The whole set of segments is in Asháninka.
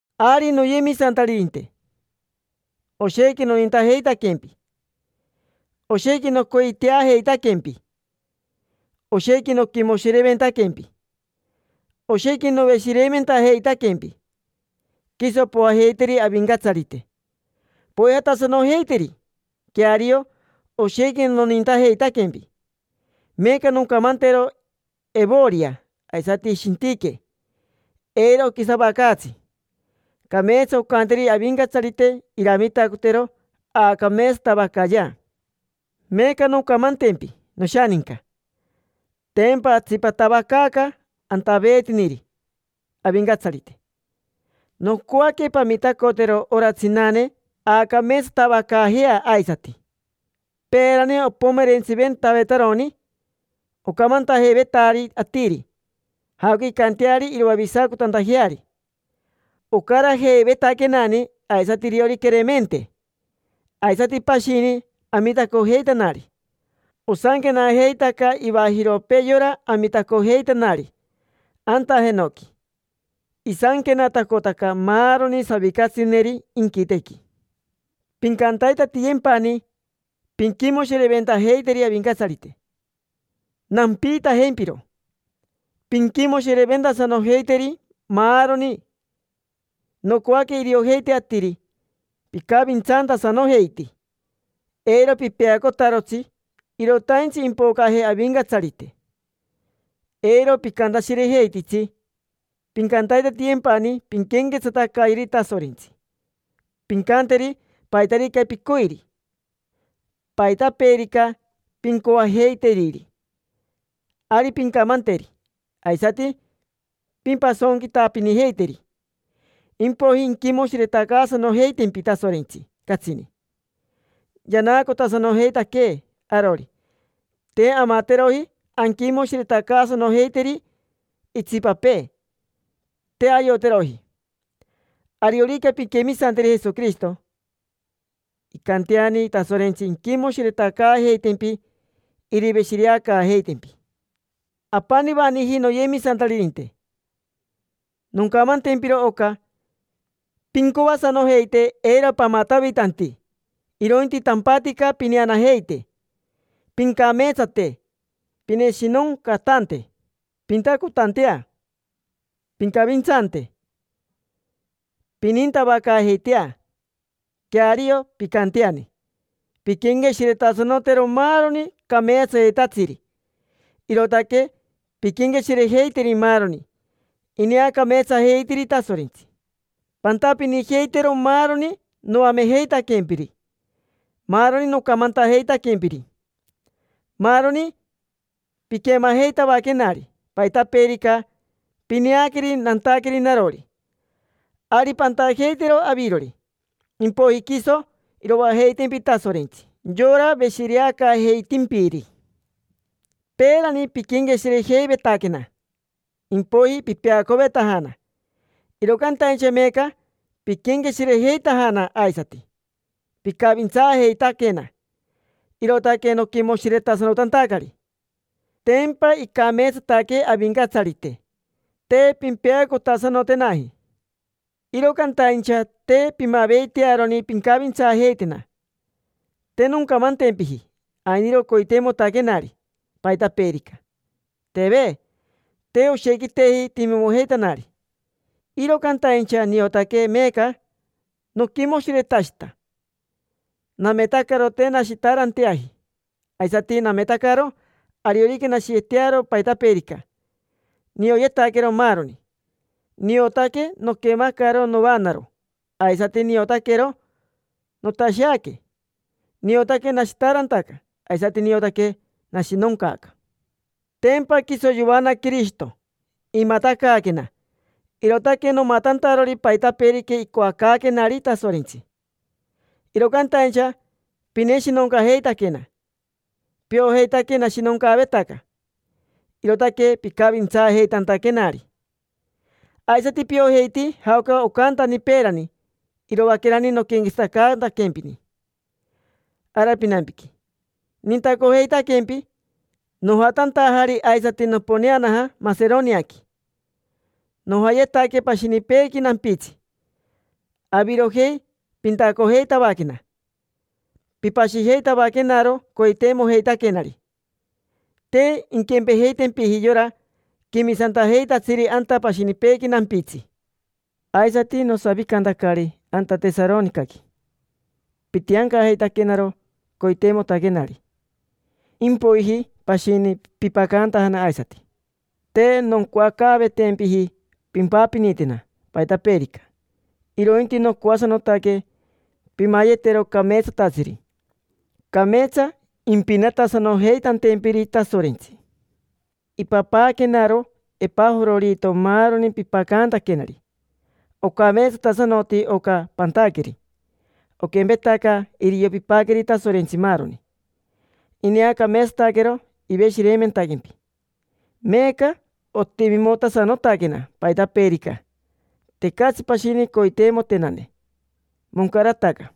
Ari, noyemisantaririnte, oshequi nonintajeitaquempi, oshequi nocoiteajeitaquempi, oshequi noquimoshireventaquempi, oshequi noveshireimentajeitaquempi. Quiso poajeiteri Avincatsarite, poijatasanojeiteri. Queario, oshequi nonintajeitaquempi. Meeca noncamantero Evoria aisati Shintique eiro oquisavacaatsi. Cameetsa oncanteri Avincatsarite iramitacotero aacameetsatavacayea. Meeca noncamantempi, noshaninca, tempa atsipatavacaaca antaveetiniri Avincatsarite: nocoaque pamitacotero ora tsinane aacameetsatavacaajea aisati. Peerani opomerentsiventavetaroni ocamantajeivetari atiri jaoca incanteari iroavisacotantajeari: ocarajeivetaquenani, aisati iriori Queremente, aisati pashini amitacojeitanari. Osanquenajeitaca ivajiropee yora amitacojeitanari anta jenoqui, isanquenatacotaca maaroni savicatsineri inquitequi. Pincantaitatiyempani pinquimoshireventajeiteri Avincatsarite. Nampiitajempiro: pinquimoshireventasanojeiteri, maaroni. Nocoaque iriojeite atiri picavintsantasanojeiti. Eiro pipeacotarotsi: irotaintsi impocaje Avincatsarite. Eiro picantashirejeititsi. Pincantaitatiyempani pinquenquetsatacayeri Tasorentsi, pincanteri paitarica picoiri. Paitapeerica pincoajeiteriri, ari pincamanteri. Aisati pimpasonquitapinijeiteri. Impoiji inquimoshiretacaasanojeitempi Tasorentsi catsini. Yanaacotasanojeitaquee arori, te amateroji anquimoshiretacaasanojeiteri itsipapee, te ayoteroji. Ariorica pinquemisanteri Jesoquirishito, incanteani Tasorentsi inquimoshiretacaajeitempi, iriveshireacaajeitempi. Apanivaniji, noyemisantaririnte, noncamantempiro oca. Pincoasanojeite eiro pamatavitanti, irointi tampatica pineanajeite, pincameetsate, pineshinoncatante, pintacotantea, pincavintsante, pinintavacaajeitea. Queario, pincanteani pinquenqueshiretasanotero maaroni cameetsayetatsiri, irootaque pinquenqueshirejeiteri maaroni ineacameetsajeitiri Tasorentsi. Pantapinijeitero maaroni noamejeitaquempiri, maaroni nocamantajeitaquempiri, maaroni piquemajeitavaquenari. Paitapeerica pineaqueri nantaqueri narori, ari pantajeitero avirori. Impoiji quiso iroajeitempi Tasorentsi: yora veshireacaajeitimpiri. Peerani piquenqueshirejeivetaquena, impoiji pipeacovetajana; iro cantaincha meeca piquenqueshirejeitajana aisati, picavintsaajeitaquena, irootaque noquimoshiretasanotantacari. Tempa icameetsataque Avincatsarite. Te pimpeacotasanotenaji, iro cantaincha te pimaveitearoni pincavintsaajeitena. Te noncamantempiji ainiro coiteimotaquenari paitapeerica: teve. Te oshequiteji timimojeitanari, iro cantaincha niotaque meeca noquimoshiretashita. Nametacaro te nashitaaranteaji, aisati nametacaro ariorica nashiyetearo paitapeerica. Nioyetaquero maaroni: niotaque noquemacaro noanaro, aisati niotaquero notasheaque. Niotaque nashitaarantaca, aisati niotaque nashinoncaaca. Tempa quiso yoana Quirishito, imatacaaquena, irootaque nomatantarori paitapeerica icoacaaquenari Tasorentsi. Iro cantaincha pineshinoncajeitaquena. Piojeitaque nashinoncaavetaca, irootaque picavintsaajeitantaquenari. Aisati piojeiti jaoca ocantani peerani, iroaquerani noquenquetsatacantaquempini ara pinampiqui, nintacojeitaquempi. Nojatantajari aisati, noponeanaja Maseroniaqui, nojayetaque pashinipeequi nampitsi. Avirojei pintacojeitavaquena, pipashijeitavaquenaro coiteimojeitaquenari. Te inquempejeitempiji yora quemisantajeitatsiri anta pashinipeequi nampitsi. Aisati, nosavicantacari anta Tesaronicaqui, pitiancajeitaquenaro coiteimotaquenari. Impoiji pashini pipacantajana aisati. Te noncoacaavetempiji pimpapinitena paitapeerica, irointi nocoasanotaque pimayetero cameetsatatsiri, cameetsa impinatasanojeitantempiri Tasorentsi. Ipapaaquenaro Epajororito maaroni pipacantaquenari. Ocameetsatasanoti oca pantaqueri, oquempetaca irio pipaqueri Tasorentsi maaroni. Ineacameetsataquero, iveshireimentaquempi. Meeca otimimotasanotaquena paitapeerica, tecatsi pashini coiteimotenane; moncarataca.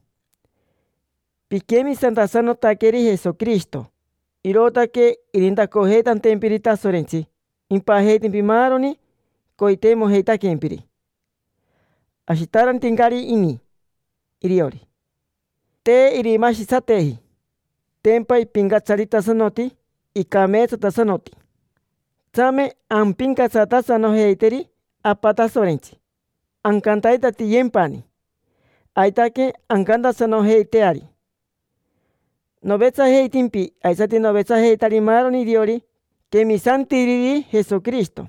Piquemisantasanotaqueri Jesoquirishito, irootaque irintacojeitantempiri Tasorentsi, impajeitempi maaroni coiteimojeitaquempiri. Ashitaarantincari ini iriori, te irimashitsateji. Tempa ipincatsaritasanoti, icameetsatasanoti. Tsame ampincatsatasanojeiteri Apa Tasorentsi, ancantaitatiyempani. Aitaque ancantasanojeiteari. Novetsajeitimpi, aisati novetsajeitari maaroni iriori quemisantiriri Jesoquirishito.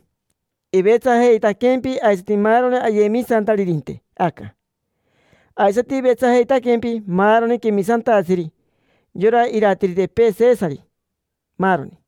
Ivetsajeitaquempi aisati maaroni ayemisantaririnte aca. Aisati ivetsajeitaquempi maaroni quemisantatsiri: yora iratiritipee Sesari, maaroni.